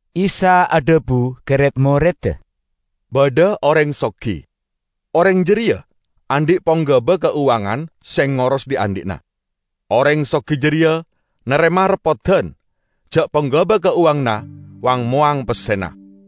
Isa adhabu ka red-moredda, "Badha oreng sogi. Oreng jareya andhi' ponggaba kauwangan se ngoros dhi'-andhi'na. Oreng sogi jareya narema reppodan ja' ponggaba kauwanganna wang-mowang pessena.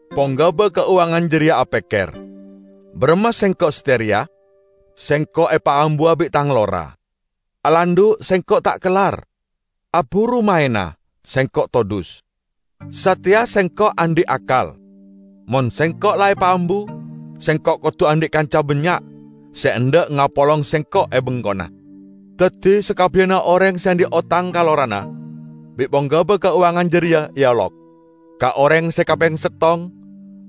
Ponggaba kauwangan jareya apekker, 'Baramma sengko' sateya reya? Sengko' epaambuwa bi' tang lora. Alandhu' sengko' ta' kellar; aburumaena sengko' todhus. Sateya sengko' andhi' akkal; mon sengko' la epaambu, sengko' kodu andhi' kanca bannya' se endha' ngapolong sengko' e bengkona!' Daddi sakabbiyanna oreng se andhi' otang ka lorana bi' ponggaba kauwangan jareya eolok. Ka oreng se kapeng settong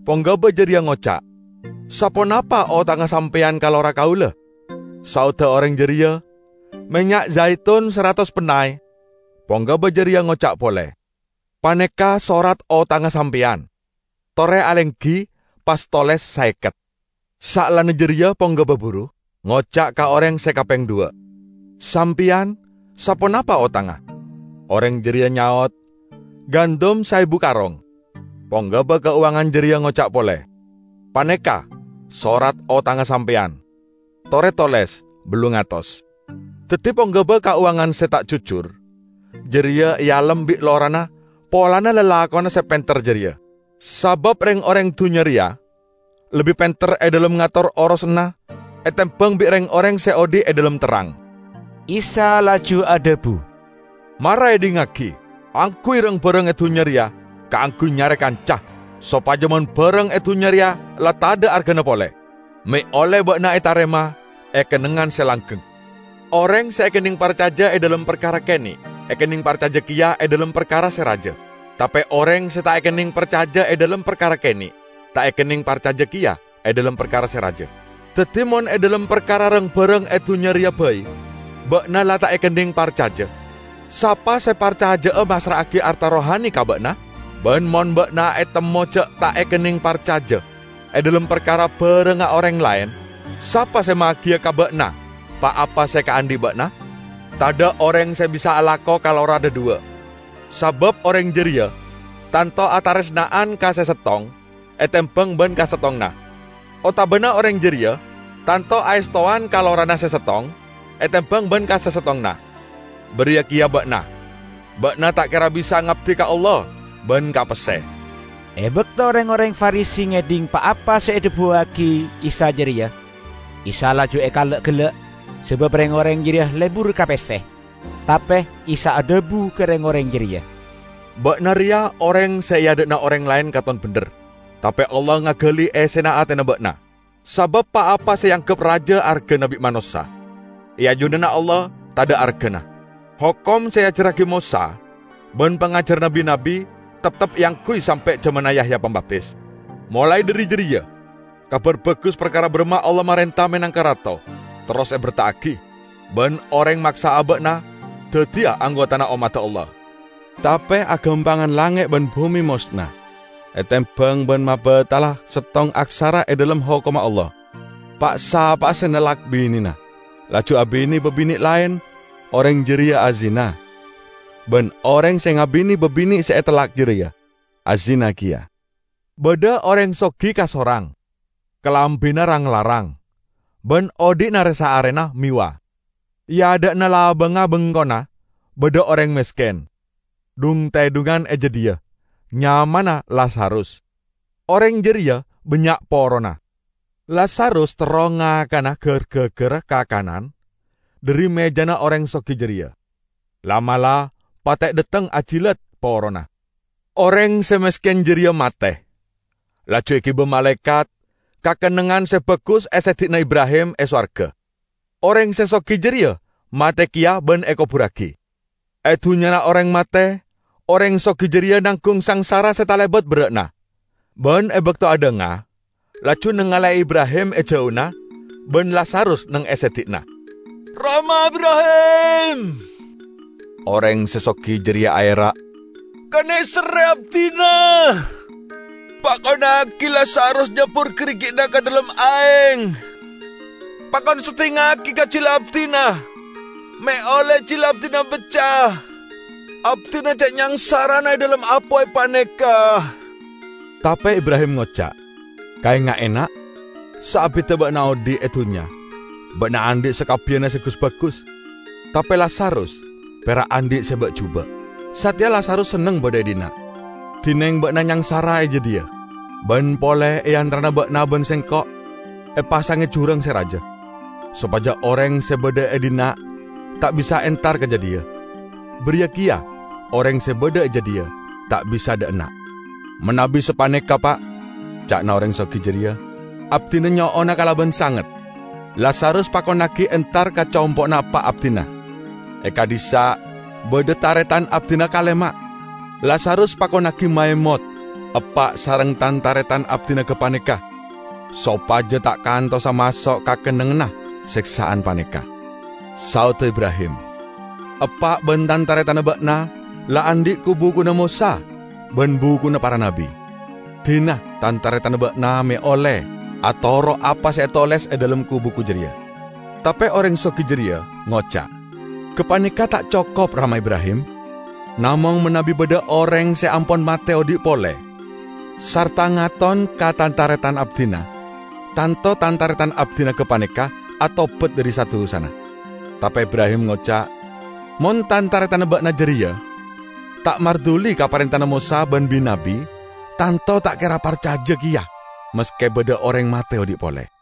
ponggaba jareya ngoca', 'Saponapa otangnga sampeyan ka lora kaula?' Saodda oreng jareya, 'Mennya' jaitun saratos pennay.' Ponggaba jareya ngoca' pole, 'Paneka' sorat otangnga sampeyan. Tore alenggi, pas toles: saeket.' Saellana jareya ponggaba buru ngoca' ka oreng se kapeng dhuwa', 'Sampeyan, saponapa otangnga?' Oreng jareya nyaot, 'Gandum saebu karong.' Ponggaba kauwangan jareya ngoca' pole, 'Paneka' sorat otangnga sampeyan. Tore toles: ballung atos.' Daddi ponggaba kauwangan se ta' jujur jareya ealem bi' lorana polana lalakonna se penter jareya; sabab reng-oreng dunnya reya lebbi penter e dhalem ngator orosanna etembang bi' reng-oreng se odhi' e dhalem terrang." Isa laju adhabu, "Mara edhingngagi! Angguy rang-barang e dunnya reya kaangguy nyare kanca, sopaja mon barang e dunnya reya la tadha' argana pole, me' olle ba'na etarema e kennengngan se langgeng. Oreng se ekenneng parcaja e dhalem parkara kene', ekenneng parcaja keya e dhalem parkara se raja. Tape oreng se ta' ekenneng parcaja e dhalem parkara kene' ta' ekenneng parcaja keya e dhalem parkara se raja. Daddi, mon e dhalem parkara rang-barang e dunnya reya bai ba'na la ta' ekenneng parcaja, sapa se parcaja'a massra'agi arta rohani ka ba'na? Ban mon ba'na etemmo ja' ta' ekenneng parcaja e dhalem parkara barangnga oreng laen, sapa se magiya ka ba'na pa-apa se ekaandhi' ba'na? Tadha' oreng se bisa alako ka lora dhadhuwa'; sabab oreng jareya tanto ataresna'an ka se settong etembang ban ka settonganna; otabana oreng jareya tanto aestowan ka lorana se settong etembang ban ka se settonganna. Bariya keya ba'na. Ba'na ta' kera bisa ngabdi ka Allah ban ka pesse." E bakto reng-oreng Farisi ngedhing pa-apa se edhabuwagi Isa jareya, Isa laju ekala'-gella', sabab reng-oreng jareya lebur ka pesse. Tape Isa adhabu ka reng-oreng jareya, "Ba'na reya oreng se e adha'na oreng laen katon bendher, tape Allah ngagali essena atena ba'na. Sabab pa-apa se eanggep raja argana bi' manossa, e ajunanna Allah tadha' argana. Hokom se eajarragi Mosa ban pangajaranna bi-nabbi, teptep eangguy sampe' jamanna Yahya Pambaptis. Molae dhari jareya Kabar Bagus parkara baramma Allah marenta menangka Rato terros eberta'agi. Ban oreng maksa aba'na daddiya anggotana ommadda Allah. Tape agampangan langnge' ban bume mosna etembang ban mabattala settong aksara e dhalem Hokomma Allah. Pa'-sapa'a nellak binena laju abine babine' laen, oreng jareya azina. Ban oreng se ngabine babine' se etellak jareya, azina keya." "Badha oreng sogi kasorang. Kalambina rang-larang, ban odhi'na re-saarena mewah. E adha'na labangnga bengkona badha oreng mesken, dhung-tedhungan e jadhiya; nyamana Lazarus. Oreng jareya bannya' porona. Lazarus terro ngakana gar-gaggarra kakanan dhari mejana oreng sogi jareya. La'-mala' pate' dhateng ajilat porona. Oreng se mesken jareya mate, laju egiba malaekat ka kennengngan se bagus e seddi'na Ibrahim e sowarga. Oreng se sogi jareya mate keya ban ekoburragi. E dunnyana oreng mate, oreng sogi jareya nanggung sangsara se talebat berra'na. Ban e bakto adhanga, laju nangale'e Ibrahim e jauna ban Lazarus neng e seddi'na. 'Rama Ibrahim!' oreng se sogi jareya aera'. 'Kaneserre abdina. Pakonnagi Lazarus nyabbur garigi'na ka dhalem aeng, pakon seddingngagi ka jila abdina me' olle jila abdina bacca. Abdina ce' nyangsarana e dhalem apoy paneka!' Tape Ibrahim ngoca', 'Kaenga'e, Na': saabidda ba'na odhi' e dunnya ba'na andhi' sakabbiyanna se gus-bagus, tape Lazarus pera' andhi' se ba'-juba'. Sateya Lazarus senneng badha e dhinna', dineng ba'na nyangsara e jadhiya. Ban pole e antarana ba'na ban sengko' epasange jurang se raja, sopaja oreng se badha e dhinna' ta' bisa entar ka jadhiya, bariya keya oreng se badha e jadhiya ta' bisa dha' enna'!' 'Manabi sapaneka, Pa',' ca'na oreng sogi jareya, 'abdina nyo'ona kalaban sanget, Lazarus pakonnagi entar ka compo'na eppa' abdina. E ka'dhissa' badha taretan abdina kalema. Lazarus pakonnagi maemot eppa' sareng tan-taretan abdina gapaneka, sopaja ta' kantosa maso' ka kennengnganna seksa'an paneka.' Saodda Ibrahim, 'Eppa' ban tan-taretanna ba'na la andhi' ku-bukuna Mosa ban bukuna para nabbi! Dina tan-taretanna ba'na me' olle atoro' apa se etoles e dhalem ku-buku jareya!' Tape oreng sogi jareya ngoca', 'Gapaneka ta' cokop, Rama Ibrahim. Namong manabi badha oreng se ampon mate odhi' pole sarta ngaton ka tan-taretan abdina, tanto tan-taretan abdina gapaneka atobat dhari sa-dusana.' Tape Ibrahim ngoca', 'Mon tan-taretanna ba'na jareya ta' marduli ka parentana Mosa ban bi-nabbi, tanto ta' kera parcaja keya maske badha oreng mate odhi' pole.' "